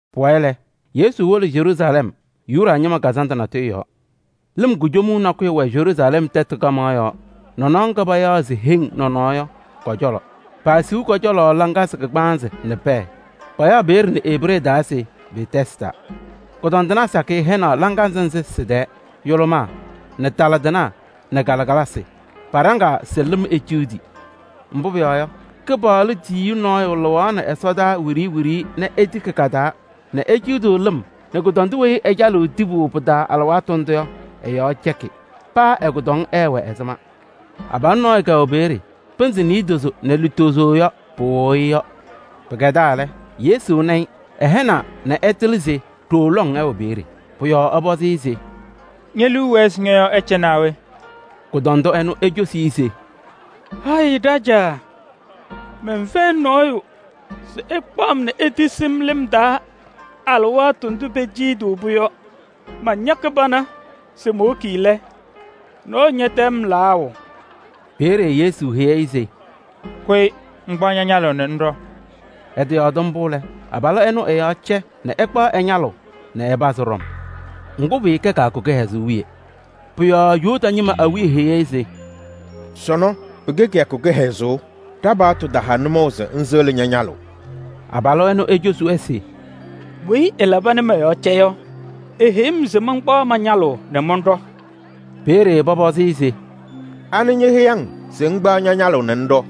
Pʋwayɩ lɛ, Yesu wolo Yeruusalɛm Yuda ñɩma kazandʋ natʋyʋ yɔɔ. Lɩm kujomuu nakʋyʋ wɛ Yeruusalɛm tɛtʋ kaɣmaɣ yɔɔ nɔnɔɔ ŋga payaɣ se Heŋ Nɔnɔɔ yɔ kɔ-cɔlɔ. Paasiɣ kʋ-cɔlɔ laŋazɩ kagbaanzɩ nɛ pɛɛ. Payaɣ peeye nɛ Ebree taa se Betɛsda. Kʋdɔndɩnaa sakɩyɛ hɛnaɣ laŋazɩ nzɩ sɩ-tɛɛ: yʋlʋmaa nɛ tala tɩnaa nɛ kalɩkalasɩ. [Paɖaŋaa se lɩm eciɣdi. Mbʋ pʋyɔɔ yɔ, Kɩpaɣlʋ tiyiyu nɔɔyʋ lɩɣaɣnɩ ɛsɔdaa wiɖiyi wiɖiyi nɛ etiki kɩ-taa nɛ eciɣdiɣ lɩm nɛ kʋdɔndʋ weyi ɛcalɩɣ tibu pɩ-taa alɩwaatʋ ndʋ yɔ, ɛ-yɔɔ cɛkɩ. Paa ɛ-kʋdɔŋ ɛɛwɛ ɛzɩma.] Abalʋ nɔɔyʋ kɛwɛ peeye. Pɩnzɩ niidozo nɛ lutozo yɔ, pɩwɩɣʋ-ɩ yɔ. Pɩkɛdaa lɛ, Yesu na-ɩ, ɛhɛnaa nɛ ɛtɩlɩ se ɖooo lɔŋ ɛwɛ peeye. Pʋ-yɔɔ ɛpɔzɩ-ɩ se: “Ñe-liu wɛɛ se ñɔ-yɔɔ ɛcɛ naa we?” Kʋdɔndʋ ɛnʋ ecosi-i se: “Hayɩ Ɖajaa! Mɛnfɛyɩ nɔɔyʋ se ɛkpaɣ-m nɛ etisi-m lɩm taa alɩwaatʋ ndʋ peciɣdiɣ-pʋ yɔ. Mañakɩ pana se mowoki lɛ, nɔɔyʋ ñɛtɛm-m layʋʋ.” Peeye Yesu heyi-i se: “Kʋyɩ ŋkpaɣ ña-ñalʋʋ nɛ ŋɖɔ!” Ɛtɩyɔɔdɩ mbʋ lɛ, abalʋ ɛnʋ ɛ-yɔɔ cɛ nɛ ɛkpaɣ ɛ-ñalʋʋ nɛ ɛpazɩ ɖɔm. Ŋgʋ, pɩɩkɛ kɩyakʋ kɩhɛzʋʋ wiye. Pʋ-yɔɔ Yuda ñɩma awiya heyi-i se: “Sɔnɔ pɩkɛ kɩyakʋ kɩhɛzʋʋ, ɖa-paɣtʋ taha nʋmɔʋ se ŋsɩɣlɩ ña-ñalʋʋ.” Abalʋ ɛnʋ ecosi-wɛ se: “Weyi ɛlaba nɛ mɔ-yɔɔ cɛ yɔ, eheyi-m se mankpaɣ ma-ñalʋʋ nɛ mɔnɖɔ.” Peeye pɔpɔzɩ-ɩ se: “Anɩ ñeheyi-ŋ se ŋkpaɣ ña-ñalʋʋ nɛ ŋɖɔ?”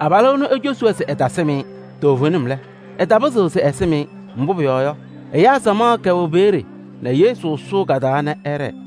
Abalʋ ɛnʋ ecosi-wɛ se ɛtasɩm-ɩ. Toovenim lɛ, ɛtapɩzɩɣ se ɛsɩm-ɩ. Mbʋ pʋyɔɔ yɔ, ɛyaa samaɣ kɛwɛ peeye nɛ Yesu sʋʋ ka-taa nɛ ɛɖɛɛ.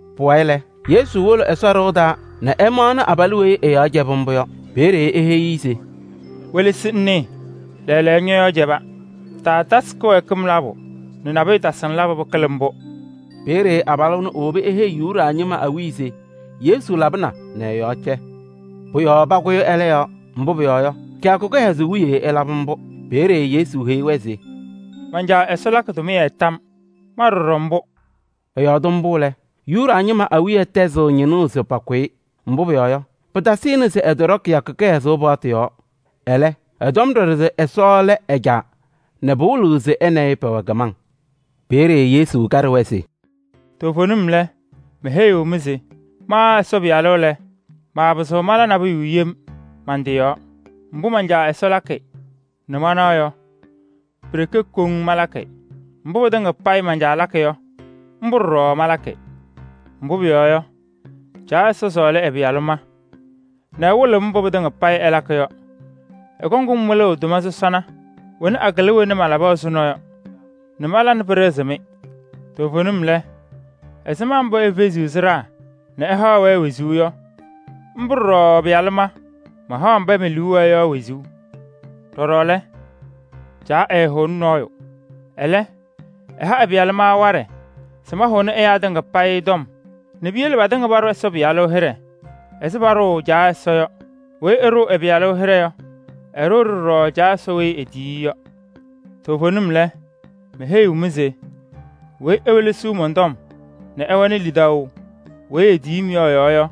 Pʋwayɩ lɛ, Yesu wolo Ɛsɔ ɖɩɣa taa nɛ ɛmaɣnɩ abalʋ weyi ɛ-yɔɔ cɛbɩ mbʋ yɔ. Peeye eheyi-i se: “Welesi ŋnɩɩ, lɛɛlɛɛyɔ, ñɔ-yɔɔ cɛba. Taatasɩ kɩwɛɛkɩm labʋ nɛ nabʋyʋ tasɩ-ŋ labʋ nɛ pɩkɩlɩ mbʋ.” Peeye abalʋ ɛnʋ ewobi eheyi Yuda ñɩma awiya se Yesu labɩna nɛ ɛ-yɔɔ cɛ. Pʋ-yɔɔ pakʋyɩ ɛlɛ yɔɔ, mbʋ pʋyɔɔ yɔ, kɩyakʋ kɩhɛzʋʋ wiye ɛlabɩ mbʋ. Peeye Yesu heyi-wɛ se: “Man-Caa Ɛsɔ lakɩ tʋmɩyɛ tam yɔɔ, ma ɖɔɖɔ mbʋ.” Ɛyɔɔdɩ mbʋ lɛ, Yuda ñɩma awiya tɛzɩɣ ñɩnʋʋ se pakʋ-ɩ. Mbʋ pʋyɔɔ yɔ, pɩtasɩnɩ se ɛtɔɖɔ kɩyakʋ kɩhɛzʋʋ paɣtʋ yɔɔ, ɛlɛ, ɛtɔm ɖɔɖɔ se Ɛsɔ lɛ ɛ-Caa nɛ pɩwɩlɩɣ se ɛ nɛ ɩ pɛwɛ kɩmaŋ. Peeye Yesu kaɖɩ-wɛ se: “Toovenim lɛ, meheyiɣ-mɩ se ma Ɛsɔ Pɩyalʋ lɛ, maapɩzɩɣ mala nabʋyʋ yem man-tɩ yɔɔ. Mbʋ man-Caa Ɛsɔ lakɩ nɛ manaɣ yɔ, pi-ɖeke koŋ malakɩ. Mbʋ pɩtɩŋa payɩ man-Caa lakɩ yɔ, mbʋ ɖɔɖɔ malakɩ. Mbʋ pʋyɔɔ yɔ, Caa Ɛsɔ sɔɔlɩ ɛ-Pɩyalʋ ma nɛ ɛwɩlɩɣ-m mbʋ pɩtɩŋa payɩ ɛlakɩ yɔ. Ɛkɔŋ-m wɩlʋʋ tʋma sɔsɔna wena akɩlɩ wena malaba ɛzʋnɔ yɔ nɛ mala nɛ pɩɖɩɣzɩ-mɩ. Toovenim lɛ, ɛzɩma mbʋ efeziɣ sɩɖaa nɛ ɛhaɣ-wɛ wezuu yɔ, mbʋ ɖɔɖɔ ɛ-Pɩyalʋ ma, mahaɣ mba me-liu wɛɛ yɔ wezuu. Ɖɔɖɔ lɛ, Caa ɛɛhʋʋnɩ nɔɔyʋ. Ɛlɛ, ɛha ɛ-Pɩyalʋ ma waɖɛ se mahʋnɩ ɛyaa tɩŋa payɩ tɔm nɛ piyele patɩŋa paɖʋ Ɛsɔ Pɩyalʋ hɩɖɛ ɛzɩ paɖʋʋ Caa Ɛsɔ yɔ. Weyi ɛɛɖʋʋ Ɛsɔ Pɩyalʋ hɩɖɛ yɔ, ɛɛɖʋʋ-ɖɩ ɖɔɖɔ Caa Ɛsɔ weyi etiyi-i yɔ. Toovenim lɛ, meheyiɣ-mɩ se weyi ewelesiɣ mɔn-tɔm nɛ ɛwɛnɩ lidaʋ weyi etiyi-m yɔ ɛ-yɔɔ yɔ,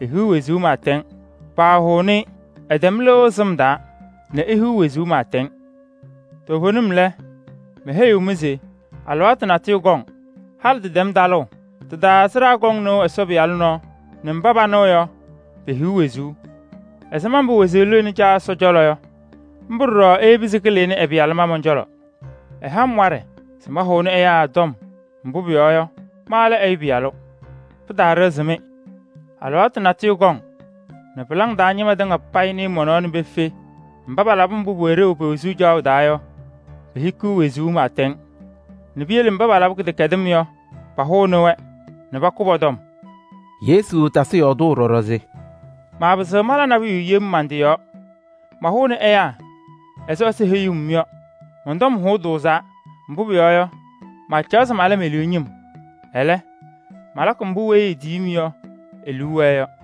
ehiɣ wezuu pɩɩtɛŋ. Paahʋʋnɩ-ɩ. Ɛtɛm lɩʋ sɩm taa nɛ ehiɣ wezuu pɩɩtɛŋ. Toovenim lɛ, meheyiɣ-mɩ se alɩwaatʋ natʋyʋ kɔŋ, halɩ tɩtɛm talʋʋ. Tɩ-taa sɩɖaa kɔŋ nɩʋ Ɛsɔ Pɩyalʋ nɔɔ nɛ mba panɩɣ yɔ, pehiɣ wezuu. Ɛzɩma mbʋ wezuu lɩɣnɩ Caa Ɛsɔ cɔlɔ yɔ, mbʋ ɖɔɖɔ eyebi se kɩlɩnɩ ɛ-Pɩyalʋ ma mɔn-cɔlɔ. Ɛha-m waɖɛ se mahʋnɩ ɛyaa tɔm, mbʋ pʋyɔɔ yɔ, ma lɛ Ɛyʋ Pɩyalʋ. Pɩtaaɖɩɣzɩ-mɩ. Alɩwaatʋ natʋyʋ kɔŋ nɛ pɩlaŋ taa ñɩma tɩŋa payɩ nɩɩ mɔ-nɔɔ nɛ pefe. Mba palabɩ mbʋ pʋwɛ ɖeu yɔ pe-wezuu caɣʋ taa yɔ, pehikiɣ wezuu pɩɩtɛŋ nɛ piyele mba paba labɩ kɩdɛkɛdɩm yɔ, pahʋnɩ-wɛ nɛ pakʋ pɔ-tɔm.” Yesu tasɩ yɔɔdʋʋ ɖɔɖɔ se: “Maapɩzɩɣ mala nabʋyʋ yem man-tɩ yɔɔ. Mahʋʋnɩ ɛyaa ɛzɩ Ɛsɔ heyuu-m yɔ. Mɔn-tɔm hʋʋ tʋʋzaa, mbʋ pʋyɔɔ yɔ, maacaɣ se mala me-liu ñɩm. Ɛlɛ, malakɩ mbʋ weyi etiyi-m yɔ e-liu wɛɛ yɔ.”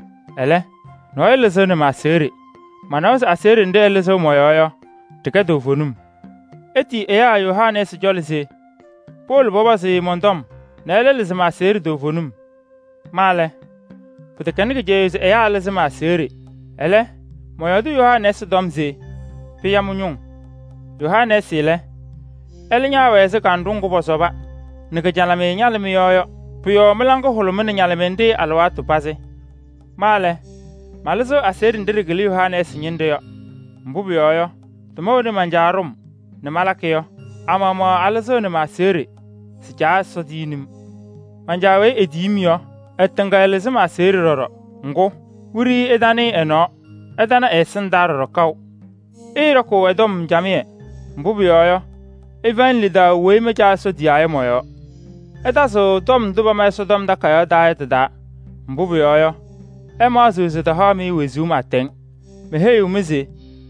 Ɛlɛ, nɔɔyʋ lɩzɩɣnɩ ma-aseɣɖe. Manawa se aseɣɖe nɖɩ ɛlɩzɩɣ mɔ-yɔɔ yɔ, ɖɩkɛ toovenim. Itiyi ɛyaa Yohanɛɛsɩ cɔlɔ se powolo pɔpɔzɩ-ɩ mɔn-tɔm nɛ ɛlɛ lɩzɩ ma-aseɣɖe toovenim. Ma lɛ, pɩtɛkɛnɩ kɩcɛyʋʋ se ɛyaa ɛlɩzɩ ma-aseɣɖe. Ɛlɛ, mɔyɔɔdɩ Yohanɛɛsɩ tɔm se pɩya mɩ-ñʋʋ. Yohanɛɛsɩ lɛ, ɛlɛ ñaawɛ ɛzɩ kanɖʋ ŋgʋ pɔsɔba nɛ kɩ-ñalɩmɩyɛ ñalɩ mɩ-yɔɔ yɔ. Pʋ-yɔɔ mɩ-laŋa hʋlʋmɩnɩ-ɖɩ alɩwaatʋ pazɩ. Ma lɛ, malɩzɩɣ aseɣɖe nɖɩ ɖɩkɩlɩ Yohanɛɛsɩ ñɩnɖɛ yɔ. Mbʋ pʋyɔɔ yɔ, tʋma wena man-Caa ɖʋ-m nɛ malakɩ yɔ, a-maɣmaɣ alɩzɩɣnɩ ma-aseɣɖe se Caa Ɛsɔ tiyini-m. Man-Caa weyi etiyi-m yɔ, ɛ-tɩ tɩŋa ɛlɩzɩ ma-aseɣɖe ɖɔɖɔ. Ŋgʋ, wiɖiyi ɩtanɩɩ ɛ-nɔɔ, ɩtana ɛ-ɛsɩndaa ɖɔɖɔ kaʋ. Ɩɩɖɔkʋʋ ɛ-tɔm camɩyɛ, mbʋ pʋyɔɔ yɔ, ɩfɛyɩnɩ lidaʋ weyi ma Caa Ɛsɔ tiyaa yɔ mɔ-yɔɔ. Ɩtazɩɣ tɔm ndʋ pama Ɛsɔtɔm Takayaɣ taa yɔ tɩ-taa, mbʋ pʋyɔɔ yɔ, ɩmaɣzɩɣ se tɩhaɣ-mɩ wezuu pɩɩtɛŋ. Meheyiɣ-mɩ se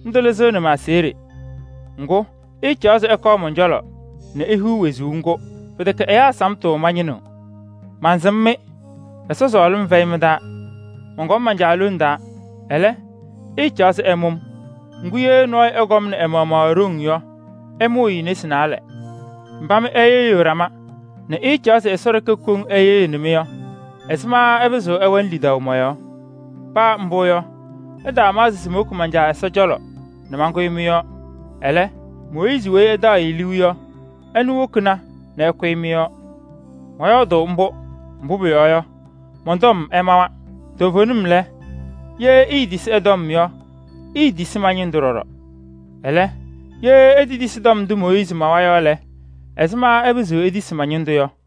ndʋ lɩzɩɣnɩ ma-aseɣɖe! Ŋgʋ, ɩɩcaɣ se ɩkɔɔ mɔn-cɔlɔ nɛ ihiɣ wezuu ŋgʋ! Pɩtɛkɛ ɛyaa samtʋ mañɩnɩɣ. Mansɩm-mɩ: Ɛsɔ sɔɔlɩm fɛyɩ mɩ-taa! Mɔnkɔm man-Caa lone taa, ɛlɛ, ɩɩcaɣ se ɩmʋ-m. Ŋgʋ, ye nɔɔyʋ ɛkɔmnɩ ɛ-maɣmaɣ e-ɖoŋ yɔ, ɩmʋʋ-ɩ nesi naalɛ. Mba mɩ ɩyɩɣyɩɣ ɖama nɛ ɩɩcaɣ se Ɛsɔ ɖeke koŋ ɛyɩɣyɩnɩ-mɩ yɔ, ɛzɩma ɩpɩzɩɣ ɩwɛnɩ lidaʋ mɔ-yɔɔ? Paa mbʋ yɔ, ɩtaamaɣzɩ se mowoki man-Caa Ɛsɔ cɔlɔ nɛ mankʋyɩ mɩ-yɔɔ. Ɛlɛ, Mooyiizi weyi ɩtaɣ-ɩ liu yɔ, ɛnʋ wokina nɛ ɛkʋyɩ mɩ-yɔɔ. Mɔyɔɔdʋʋ mbʋ, mbʋ pʋyɔɔ yɔ, mɔn-tɔm ɛmawa. Toovenim lɛ, ye iitisi ɛ-tɔm yɔ, iitisi ma-ñɩndʋ ɖɔɖɔ. Ɛlɛ, ye itetisi tɔm ndʋ Mooyiizi mawa yɔ lɛ, ɛzɩma ɩpɩzɩɣ itisi ma-ñɩndʋ yɔ?”